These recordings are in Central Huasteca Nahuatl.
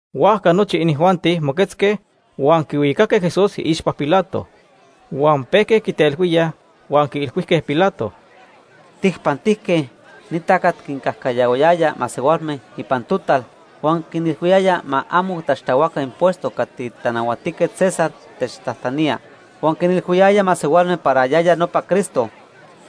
Huajca nochi inijuanti moquetzque huan quihuicaque Jesús iixpa Pilato. Huan pejque quitelhuíaj huan quiilhuijque Pilato: ―Tijpantijque ni tacat quincajcayahuayaya masehualme ipan total huan quinilhuiyaya ma amo taxtahuaca impuesto cati Tanahuatijquet César techtajtanía. Huan quinilhuiyaya masehualme para yaya nopa Cristo,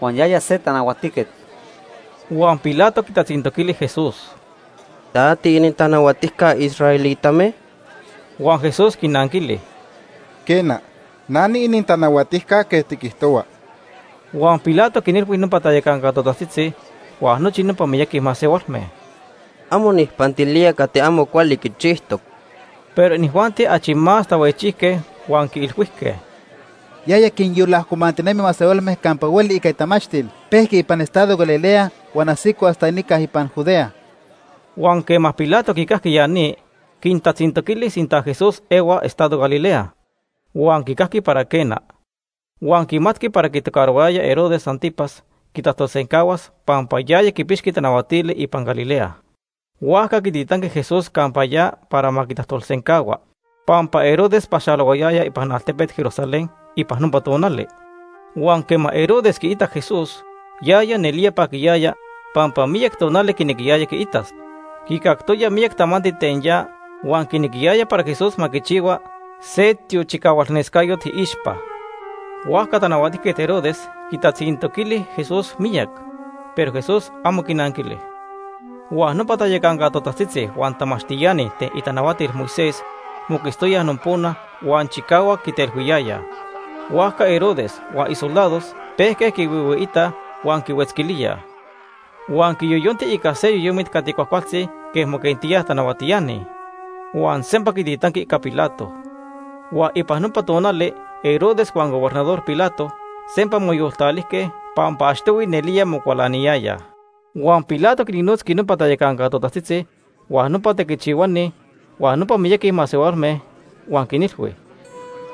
huan yaya se tanahuatijquet. Huan Pilato quitatzintoquili Jesús: ―¿Ta tiinintanahuatijca israelitame? Huan Jesús quinanquili: ―Quena, na niinintanahuatijca quej tiquijtohua. Huan Pilato quinilhui nopa tayacanca totajtzitzi, huan nochi nopa miyaqui masehualme: ―Amo nijpantilía cati amo cuali quichijtoc. Pero inijuanti achi más tahuejchijque huan quiilhuijque: ―Yaya quinyolajcomantinemi masehualme campa hueli ica itamachtil. Pejqui ipan estado Galilea huan ajsico hasta nica ipan Judea. Huan quema Pilato quicajqui ya ni, quintatzintoquili sinta Jesús ehua estado Galilea. Huan quicajqui para quena, huan quimatqui para quitocarohuayaya Herodes Ántipas quitajtolsencahuas pampa yaya quipixqui tanahuatili ipan Galilea. Huajca quititanqui Jesús campa ya para ma quitajtolsencahua, pampa Herodes paxalohuayaya ipan altepet Jerusalén ipan nopa tonali. Huan quema Herodes quiitac Jesús, yaya nelía paquiyaya pampa miyac tonali quinequiyaya quiitas. Quicactoya miyac tamanti ten ya huan quinequiyaya para Jesús ma quichihua se tiochicahualnescayot iixpa. Huajca Tanahuatijquet Herodes quitatzintoquili Jesús miyac, pero Jesús amo quinanquili. Huan nopa tayacanca totajtzitzi huan tamachtiani ten itanahuatil Moisés moquetztoyaj nopona, huan chicahuac quitelhuiyayaj. Huajca Herodes huan isoldados pejque quihuihuiitaj huan quihuetzquilíaj. Huan quiyoyonti ica se yoyomit cati cuajcualtzi quej moquentíaj tanahuatiani, huan sempa quititanqui ica Pilato. Huan ipan nopa tonali Herodes huan Gobernador Pilato sempa moyoltalijque pampa achtohui nelía mocualaniyayaj. Huan Pilato quinnotzqui nopa tayacanca totajtzitzi, huan nopa tequichihuani, huan nopa miyaqui masehualme huan quinilhui: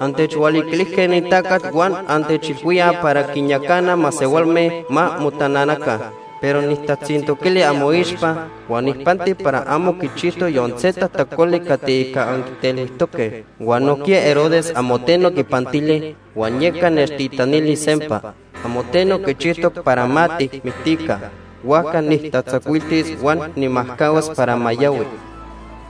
―Antechhualiquilijque ni tacat huan antechilhuíaj para quinyacana masehualme ma motananaca. Pero nijtatzintoquili amoixpa, huan nijpanti para amo quichijtoc yon se tajtacoli cati ica anquitelhuijtoque. Huan nojquiya Herodes amo teno quipantili, huan yeca nechtitanili sempa. Amo teno quichijtoc para ma tijmictica. Huajca nijtatzacuiltis huan nijmajcahuas para ma yahui.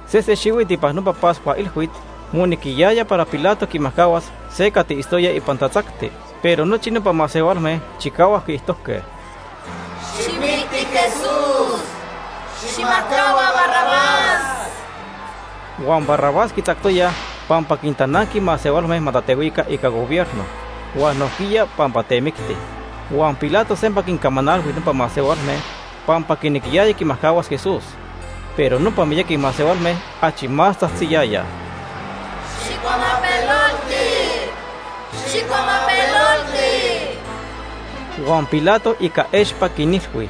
Sesen xihuit ipan nopa Pascua Ilhuit monejqui para Pilato quimajcahuas se cati itztoya ipan tatzacti. Pero nochi nopa masehualme chicahuac quiijtojque: ―¡Xijmicti Jesús! ¡Xijmajcahua Barrabás! Huan Barrabás quitzactoyaj pampa quintananqui masehualme ma tatehuica ica gobierno, huan nojquiya pampa temicti. Huan Pilato sempa quincamanalhui nopa masehualme pampa quinequiyaya quimajcahuas Jesús, pero nopa miyaqui masehualme achi más tzajtziyayaj: ―¡Xijcuamapelolti! ¡Xijcuamapelolti! Huan Pilato ica expa quinilhui: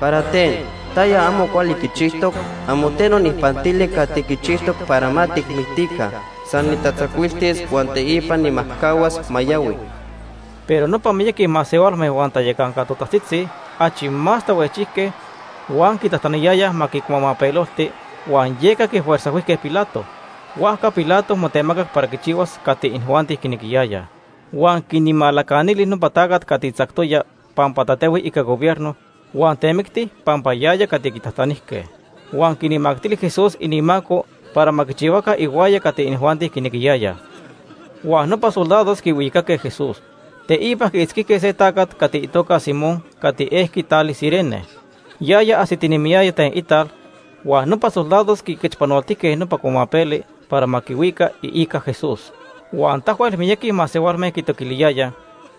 ―¿Para ten? ¿Taya amo cuali quichijtoc? Amo teno nijpantili cati quichijtoc para ma tijmictica. San nijtatzacuiltis huan teipa nijmajcahuas ma yahui. Pero nopa miyaqui masehualme huan tayacanca totajtzitzi achi más tahuejchijque huan quitajtaniyayaj ma quicuamapelolti, huan yeca quifuerzajhuijque Pilato. Huajca Pilato motemacac para quichihuas cati inijuanti quinequiyayaj. Huan quinmalacanili nopa tacat cati tzactoya pampa tatehui ica gobierno huan temicti pampa yaya cati quitajtanijque. Huan quinmactili Jesús inimaco para ma quichihuaca ihuaya cati inijuanti quinequiyayaj. Huan nopa soldados quihuicaque Jesús. Teipa quiitzquijque se tacat cati itoca Simón cati ejqui tali Cirene. Yaya ajsitinemiyaya ten ital huan nopa soldados quiquechpanoltijque nopa cuamapeli para ma quihuica iica Jesús. Huan tahuel miyaqui masehualme quitoquiliyayaj,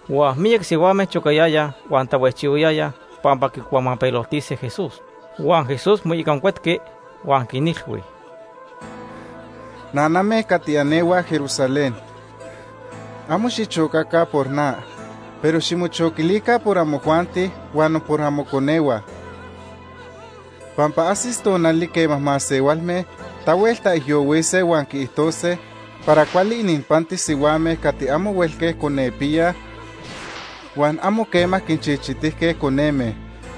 huan miyac sihuame chocayayaj huan tahuejchihuayayaj pampa quicuamapeloltise Jesús. Huan Jesús moicancuetqui huan quinilhui: ―Naname cati anehuaj Jerusalén. Amo xichocaca por na, pero ximochoquilica por amojuanti huan por amoconehua. Pampa ajsis tonali quema masehualme tahuel taijyohuise huan quiijtose para cuali ininpantis sihuame cati amo huelque conepiyaj huan amo quema quinchichitijque coneme.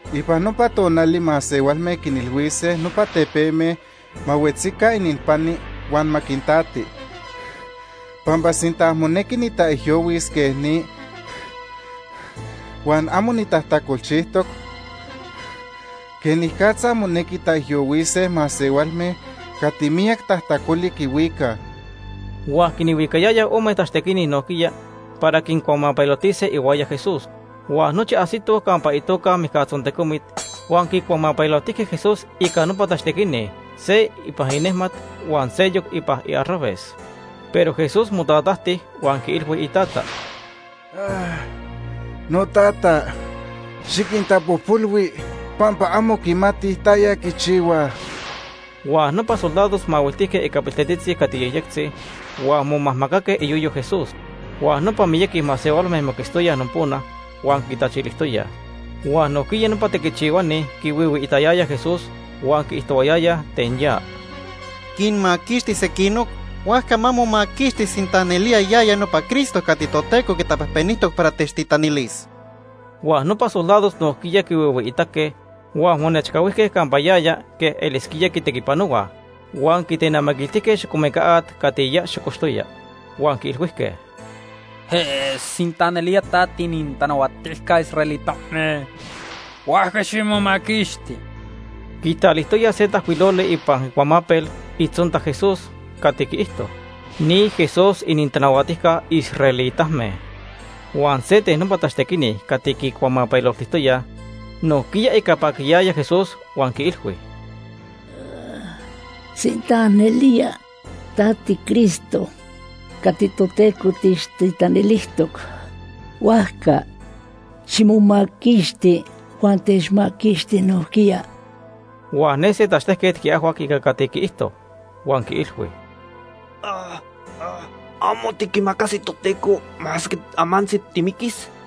Ipan nopa tonali masehualme quinilhuise nopa tepeme ma huetzi ininpani huan ma quintati. Pampa sinta monequi nitaijyohuis quej ni, huan amo nitajtacolchijtoc, ¿quenicatza monequi taijyohuise masehualme cati miyac tajtacoli quihuicaj? Huan quinhuicayayaj ome tachtequini nojquiya para quincuamapeloltise ihuaya Jesús. Huan nochi ajsitoj campa itoca Mijcatzontecomit, huan quicuamapeloltijque Jesús ica nopa tachtequini, se ipan inejmat huan seyoc ipan iarraves. Pero Jesús motatajti huan quiilhui iTata: “Notata, xiquintapojpolhui pampa amo quimatij taya quichihuaj.” Huan nopa soldados mahuiltijque ica piltetzitzi cati yejyectzi huan momajmacaque iyoyo Jesús. Huan nopa miyaqui masehualme moquetztoyaj nopona huan quitachilijtoyaj. Huan nojquiya nopa tequichihuani quihuihuiitayayaj Jesús huan quiijtohuayayaj ten ya: ―Quinmaquixti sequinoc, huajca ma momaquixti sinta nelía yaya nopa Cristo cati Toteco quitapejpenijtoc para techtitanilis. Huan nopa soldados nojquiya quihuihuiitaque huan monechcahuijque campa yaya quej elisquía quitequipanohuaj huan quitenamiquiltijque xocomeca at cati ya xocoxtoya, huan quiilhuijque: ―Sinta nelía ta tiinintanahuatijca israelitame, huajca ximomaquixti. Quitalijtoyaj se tajcuiloli ipan icuamapel itzonta Jesús cati quiijto: NI JESÚS ININTANAHUATIJCA ISRAELITAME. Huan se ten nopa tachtequini cati quicuamapeloltijtoyaj nojquiya ica paquiyaya Jesús huan quiilhui: ―Sinta nelía ta tiCristo cati Toteco techtitanilijtoc, huajca ximomaquixti huan techmaquixti nojquiya. Huan ne se tachtejquet quiajhuac ica cati quiijto, huan quiilhui: ―¿Amo tiquimacasi Toteco, masque amantzi timiquis?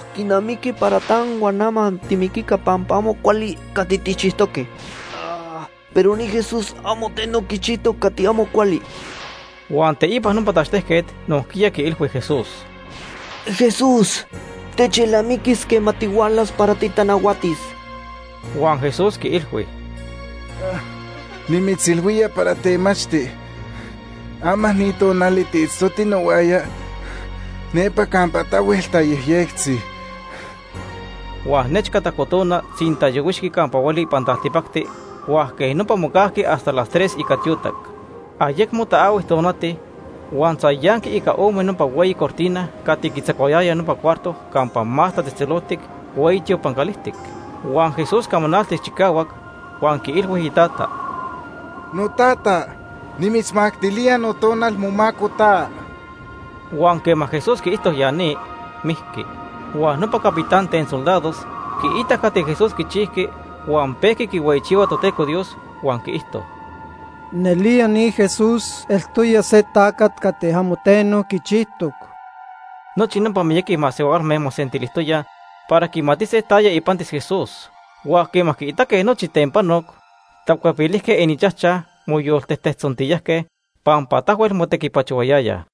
Quinamiqui para ta huan na ma timiquica pampa amo cuali cati tijchijtoque, pero ni Jesús amo teno quichijtoc cati amo cuali. Huan teipa nopa tachtejquet nojquiya quiilhui Jesús: ―Jesús, techelnamiquis quema tihualas para titanahuatis. Huan Jesús quiilhui: ―Nimitzilhuía para temachti, ama ni tonali tiitztoti nohuaya nepa campa tahuel tayejyectzi. Huan nechca tajco tona, tzintayohuixqui campa hueli ipan taltipacti huan quej nopa mocajqui hasta las tres ica tiotac. Ayecmo taahui tonati, huan tzayanqui ica ome nopa hueyi cortina cati quitzacuayaya nopa cuarto Campa Más Tatzejtzeloltic hueyi tiopan calijtic. Huan Jesús camanaltic chicahuac, huan quiilhui iTata: ―Notata, nimitzmactilía notonal momaco ta. Huan quema Jesús quiijto ya ni, mijqui. Huan nopa capitán ten soldados quiitac cati Jesús quichijqui, huan pejqui quihueyichihua Toteco Dios huan quiijto: ―Nelía ni Jesús eltoya se tacat cati amo teno quichijtoc. Nochi nopa miyaqui masehualme mosentilijtoyaj para quimatise taya ipantis Jesús, huan quema quiitaque nochi ten panoc, tacuepilijque ininchajchaj moyoltejtejtzontiyajque pampa tahuel motequipachohuayayaj.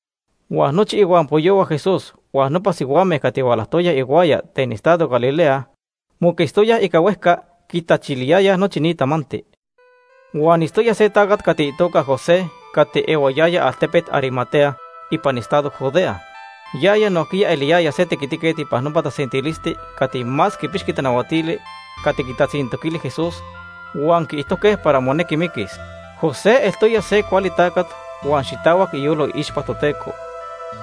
Huan nochi ihuampoyohua Jesús huan nopa sihuame cati hualajtoyaj ihuaya ten estado Galilea moquetztoyaj ica huejca, quitachiliyayaj nochi ni tamanti. Huan itztoya se tacat cati itoca José cati ehuayaya altepet Arimatea ipan estado Judea. Yaya nojquiya eliyaya se tequitiquet ipan nopa tasentilisti cati más quipixqui tanahuatili cati quitatzintoquili Jesús huan quiijtojque para monequi miquis. José eltoya se cuali tacat huan xitahuac iyolo iixpa Toteco.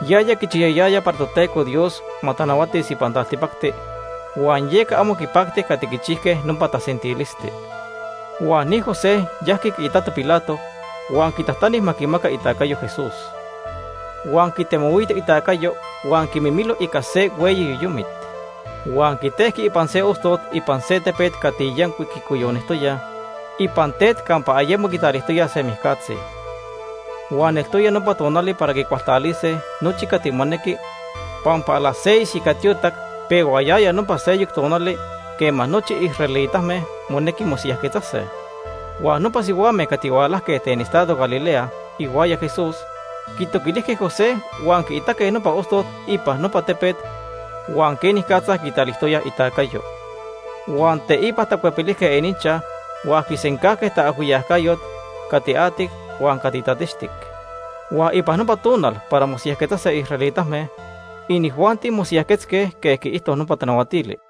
Yaya quichiyayaya para Toteco Dios ma tanahuatis ipan taltipacti huan yeca amo quipacti cati quichijque nopa tasentilisti. Huan ni José yajqui quiitato Pilato huan quitajtani ma quimaca itacayo Jesús. Huan quitemohuito itacayo huan quimimilo ica se hueyi yoyomit. Huan quitejqui ipan se ostot ipan se tepet cati yancuic quicoyonijtoya ipan tet campa ayemo quitalijtoyaj se mijcatzi. Huan eltoya nopa tonali para quicualtalise nochi cati monequi pampa a las seis ica tiotac pehuayaya nopa seyoc tonali quema nochi israelitame monequi mosiyajquetzase. Huan nopa sihuame cati hualajque ten estado Galilea ihuaya Jesús quitoquilijque José huan quiitaque nopa ostot ipan nopa tepet huan quenicatza quitalijtoya itacayo. Huan teipa tacuepilijque ininchaj huan quisencajque taajhuiyacayot cati atic huan cati tatixtic. Huan ipan nopa tonal para mosiyajquetzase israelitame, inijuanti mosiyajquetzque quej quiijto nopa tanahuatili.